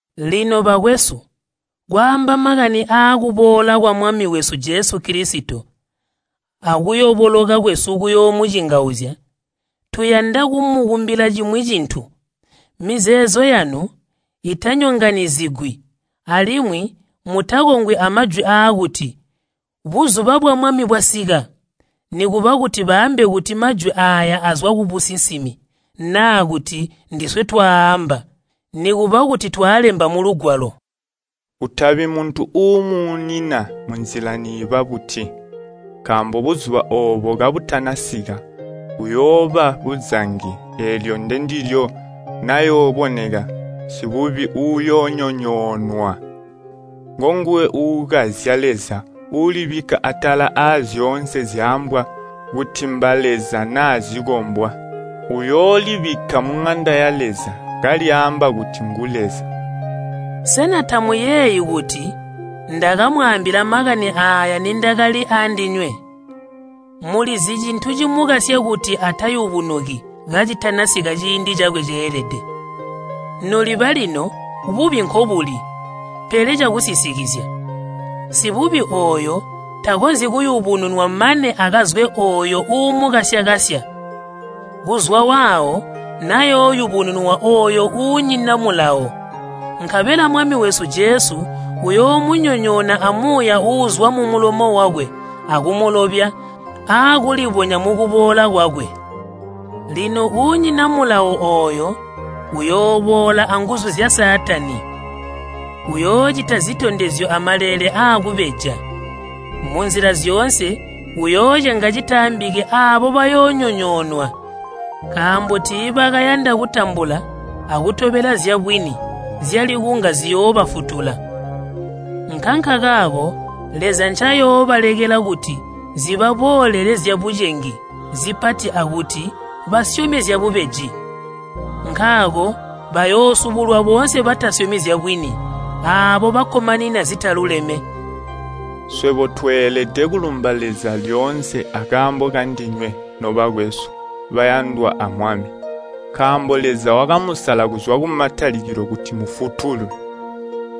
Lino, bakwesu, kwaamba makani aakuboola kwa Mwami wesu Jesu Kilisito akuyoboloka kwesu kuyoomucingauzya, tuyanda kumukumbila cimwi cintu. Mizeezo yanu itanyonganyizigwi, alimwi mutakongwi amajwi aakuti, “Buzuba bwa Mwami bwasika,” nikuba kuti baambe kuti majwi aaya azwa kubusinsimi, naa kuti ndiswe twaaamba, nikuba kuti twaalemba mulugwalo. Kutabi muntu uumuunina munzila niiba buti. Nkaambo buzuba oobo kabutanasika, kuyooba buzangi eelyo ndendilyo nayooboneka Sibubi uuyoonyonyoonwa. Ngonguwe uukazya Leza uulibikka atala azyoonse zyaambwa kuti mbaleza naa zikombwa. Uyoolibikka muŋanda ya Leza, kalyaamba kuti ngu Leza. Sena tamuyeeyi kuti ndakamwaambila makani aaya nindakali aandinywe? Mulizi cintu cimukasya kuti atayubunuki kacitanasika ciindi cakwe ceelede. Noliba lino bubi nkobuli, pele cakusisikizya. Sibubi ooyo takonzyi kuyubununwa mane akazwe ooyo uumukasya-kasya. Kuzwa waawo nayooyubununwa ooyo uunyina mulawo. Nkabela Mwami wesu Jesu uyoomunyonyoona amuuya uuzwa mumulomo wakwe akumulobya aakulibonya mukuboola kwakwe. Lino uunyina mulawo ooyo uyooboola anguzu zya Saatani. Uyoocita zitondezyo amaleele aakubeja. Munzila zyoonse uyoocenga citaambiki aabo bayoonyonyoonwa nkaambo tiibakayanda kutambula akutobela zyabwini zyali kunga ziyoobafutula. Nkankakaako Leza ncayoolekela kuti zibaboolele zyabucengi zipati akuti basyome zyabubeji. Nkaako bayoosubulwa boonse batasyomi zyabwini, aabo bakkomanina zitaluleme. Swebo tweelede kulumba Leza lyoonse akaambo kandinywe, nobakwesu, bayandwa a Mwami. Nkaambo Leza wakamusala kuzwa kumatalikilo kuti mufutulwe.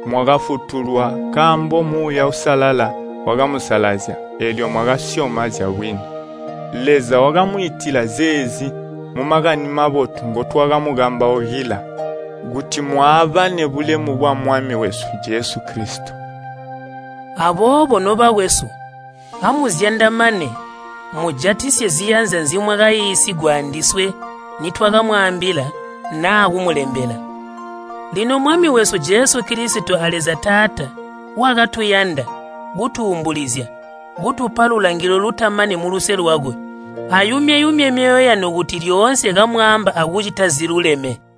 Mwakafutulwa nkaambo Muuya Uusalala wakamusalazya eelyo mwakasyoma zyabwini. Leza wakamwiitila zeezi mu Makani Mabotu ngotwakamukambaukila, kuti mwaabane bulemu bwa Mwami wesu Jesu Kilisito. Aboobo, nobakwesu, amuzyandamane mujatisye ziyanza nzimwakaiisigwa andiswe nitwakamwaambila naa kumulembela. Lino Mwami wesu Jesu Kilisito a Leza Taata wakatuyanda, kutuumbulizya, kutupa lulangilo lutamani muluse lwakwe ayumye-yumye myoyo yanu kuti lyoonse kamwaamba akucita ziluleme.